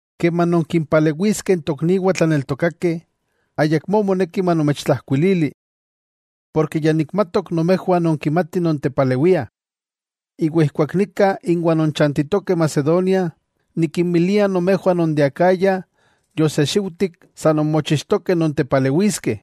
Keman nonkinpalewiskeh n tokniwah tlaneltokakeh, ayakmó moneki manomechtlajkuilili. Porke ya nikmatok nomejwah nonkimatih nontepalewiah. Iwa ijkuak nika inwah non chantitokeh Macedonia, nikinmilia nomejwah non de Acaya yosexiujtik sa non mochixtokeh non tepalewiskeh.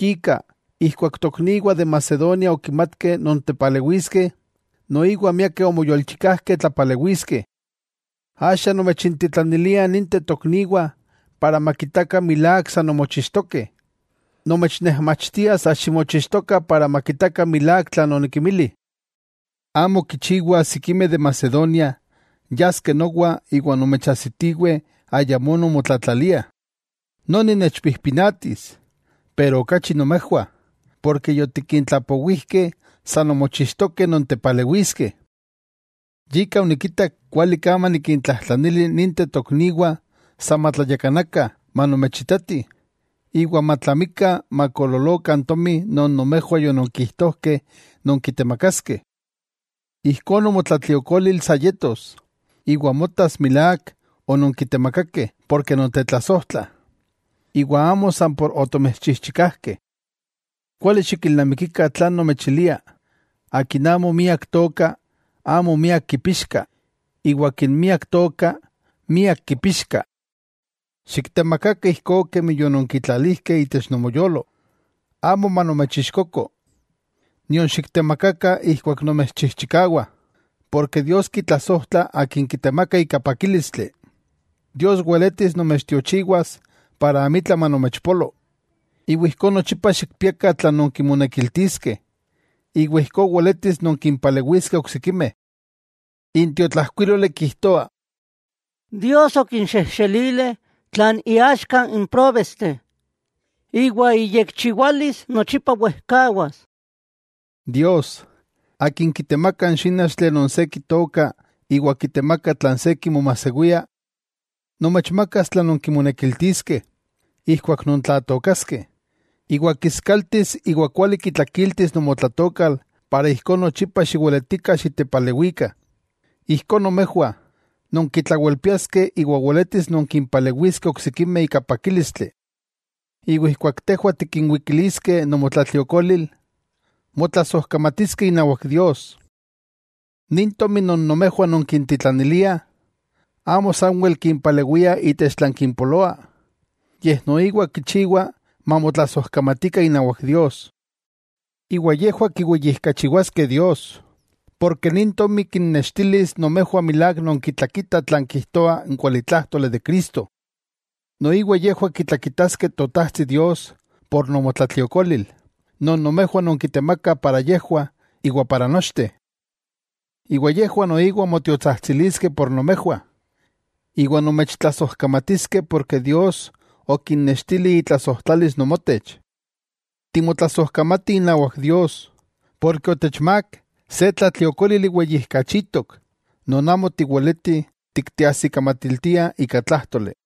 Yika ijkuak tokniwah de Macedonia okimatkeh non tepalewiskeh, noiwa miakeh omoyolchikajkeh tlapalewiskeh. Axa nomechintitlanilia ninteh tokniwah makitakah milák sa nonmochixtokeh. Nomechnejmachtia sa ximochixtokah para makitakah milák tlan onikimili. Amo kichiwa sikimeh de Macedonia yaskeh nowa iwa nomechajsitiweh ayamó nonmotlatlaliah. Noni techpijpinatis, iwa okachi nomejwah, ken yotikintlapowijkeh sa nonmochixtokeh nontepalewiskeh. Yika onikitak kuali ka manikintlajtlanili ninteh tokniwah sa matlayakanakah manomechitatih, iwa matlamikah makoololokah n tomi non nomejwah yononkijtojkeh nonkitemakaskeh. Ijkó nomotlatliokolil sa yetos, iwa motas milák ononkitemakakeh porke nontetlasojtlah, iwa amo san por otomechchijchikajkeh. Kuali xikilnamikikah tlan nomechilia: Akin amo miak tooka, amo miak kipixka; iwa akin miak tooka, miak kipixka. Xiktemakakah ijkó kemi yononkitlalijkeh itech nomoyolo, amo manomechixkoko nion xiktemakakah ijkuak nomechchijchikawah, porke Dios kitlasojtla akin kitemaka ika pakílistli. Dios weletis nomechtiochiwas para amitla manomechpolo, iwa ijkó nochipa xikpiakah tlan nonkimonekiltiskeh iwa ijkó weletis nonkimpalewiskeh oksikimeh. N tiotlajkuíloli kijtoa: Dios okinxejxelilih tlan iaxka n próbesteh, iwa iyekchiwalis nochipa wejkawas. Dios, Akin kitemaka n xínachtli non se kitooka iwa kitemaka tlan se kimomajsewia, nomechmakas tlan nonkimonekiltiskeh ijkuak nontlatookaskeh, iwa kiskaltis iwa kuali kitlakiltis nomotlatookal iwa ijkó nochipa xiweletikah xitepalewikah. Ijkó nomejwah nonkitlawelpiaskeh iwa weletis nonkimpalewiskeh oksikimeh ika pakílistli. Iwa ijkuak tejwah tikinwikiliskeh nomotlatliokolil, motlasojkamatiskeh inawak Dios. Nin tomi non nomejwah nonkintitlaniliah, amo sanwel kimpalewia itech tlan kimpoloa, yej noiwa kichiwa mamotlasojkamatikah inawak Dios. Iwa yejwah kiweyijkachiwaskeh Dios, porke nin tomi kinnextilis nomejwah milák nonkitlakitah tlan kijtoa n kualitlájtoli de Cristo. Noiwa yejwah kitlakitaskeh Totajtsi Dios por nomotlatliokolil non nomejwah nonkitemakah para yejwah iwa para nochteh. Iwa yejwah noiwa motiotsajtsiliskeh por nomejwah, iwa nomechtlasojkamatiskeh porke Dios okinnextili itlasojtlalis nomotech. ¡Timotlasojkamatih inawak Dios porke otechmák se tlatliokólili weyijkachitok, non amo tiweletih tikteajsikamatiltiah ika tlájtoli!